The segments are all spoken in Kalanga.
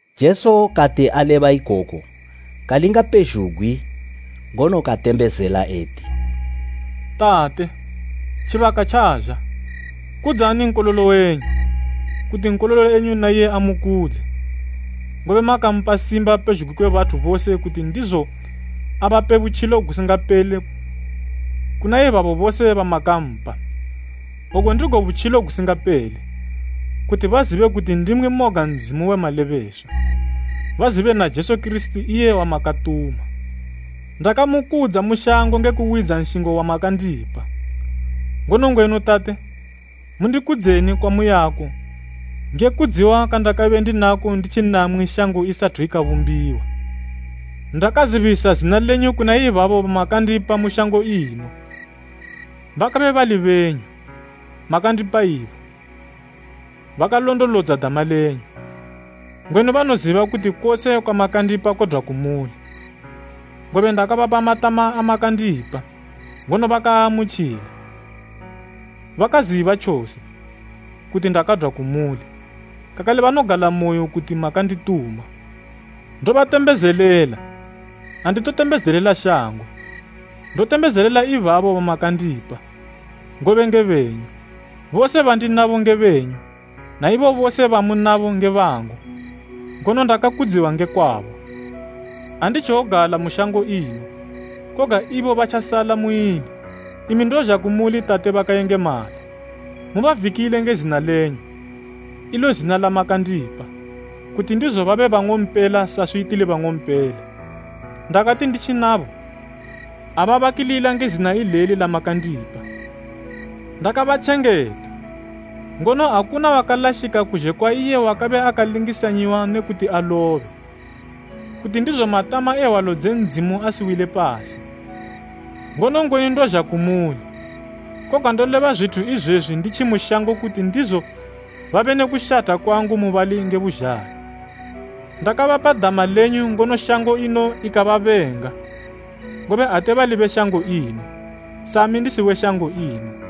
Jesu kati aleba ikoku, kalinga pezhugwi ngono katembezela eti, “Tate, tjibaka tjazha. Kudzani Nkololo wenyu, kuti Nkololo na iye amukudze, ngobe makampa simba pezhugwi kwe bathu bose kuti ndizo ape butjilo gusingapele kuna ibabo bose bamakampa. Ogu ndigo butjilo gusingapele, kuti bazibe kuti ndimwi moga Ndzimu we malebeswa, bazibe na Jesu Kirisiti iye wamakatuma. Ndakamukudza mu shango nge kuwidza nshingo wamakandipa. Ngono ngwenu Tate, mundikudzeni kwamuyako nge kudziwa kwandakabe ndinako nditji namwi shango isathu ikabumbiwa. “Ndakazibisa zina lenyu kuna ibabo bamakandipa mu shango ino. Bakabe bali benyu, makandipa ibo. Bakalondolodza dama lenyu. Ngwenu banoziba kuti kose kwamakandipa kodwa kumuli; ngobe ndakabapa matama amakandipa, ngono bakaamutjila. Bakaziba tjose, kuti ndakadwa kumuli, kakale banogalamoyo kuti makandituma. “Ndobatembezelela; anditotembezelela shango, ndotembezelela ibabo bamakandipa, ngobe nge benyu. Bose bandinabo nge benyu, na ibo bose bamunabo nge bangu, ngono ndakakudziwa nge kwabo. Anditjowogala mu shango ino, koga ibo batjasala muili, imi ndozha kumuli Tate bakayengemala, mubavikile nge zina lenyu, ilo zina lamakandipa, kuti ndizo babe bang'ompela saswi tili bang'ompela. Ndakati nditji nabo, ababakilila nge zina ileli lamakandipa. Ndakabatjengeta ngono, akuna wakalashika kuzhe kwa iye wakabe akalingisanyiwa ne kuti alobe, kuti ndizo matama e hwalo dze Ndzimu asiwile pasi. Ngono ngwenu ndozha kumuli, koga ndoleba zwithu izwezwi nditjimu shango kuti ndizo babe ne kushatha kwangu mubali nge buzhalo. Ndakabapa dama lenyu ngono shango ino ikababenga, ngobe ate bali be shango ino, sami ndisi we shango ino.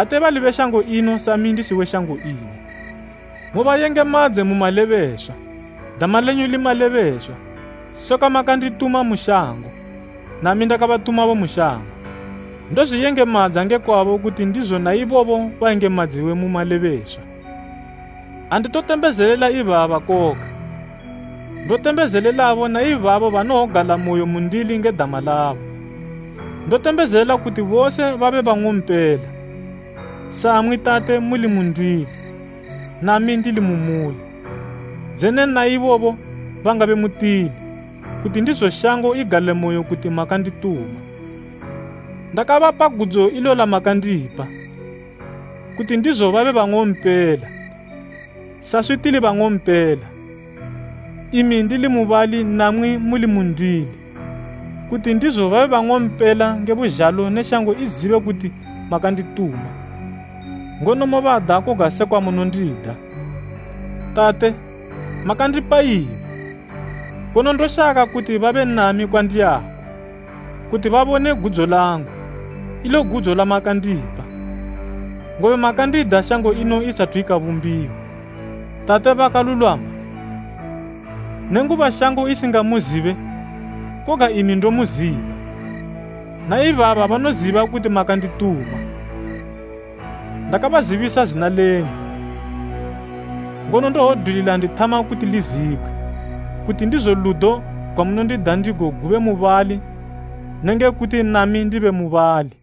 Ate bali be shango ino sami ndisi we shango ino. Mubayengemadze mu malebeswa, dama lenyu li malebeswa. Sekwa makandituma mu shango, nami ndakabatumabo mu shango. Ndozwiyengemadza nge kwabo kuti ndizo na ibobo bayengemadziwe mu malebeswa. “Anditotembezelela ibaba koga, ndotembezelelabo na ibabo banowogalamoyo mundili nge dama labo. Ndotembezela kuti bose babe bang'ompela. Samwi Tate, muli mundili, nami ndili mu muli, dzene na ibobo bangabe mutili, kuti ndizo shango igalemoyo kuti makandituma. Ndakabapa gudzo ilo lamakandipa, kuti ndizo babe bang'ompela, saswi tili bang'ompela, imi ndili mubali namwi muli mundili, kuti ndizo babe bang'ompela nge buzhalo ne shango izibe kuti makandituma, ngono mobada koga sekwa munondida. “Tate! Makandipa ibo, ngono ndoshaka kuti babe nami kwandiyako, kuti babone gudzo langu, ilo gudzo lamakandipa, ngobe makandida shango ino isathu ikabumbiwa. Tate bakalulwama, nenguba shango isingamuzibe, koga imi ndomuziba, na ibaba banoziba kuti makandituma. Ndakabazibisa zina lenyu, ngono ndowodwilila ndithama kuti lizibgwe, kuti ndizo ludo gwamunondida ndigo gube mubali ne nge kuti nami ndibe mubali.”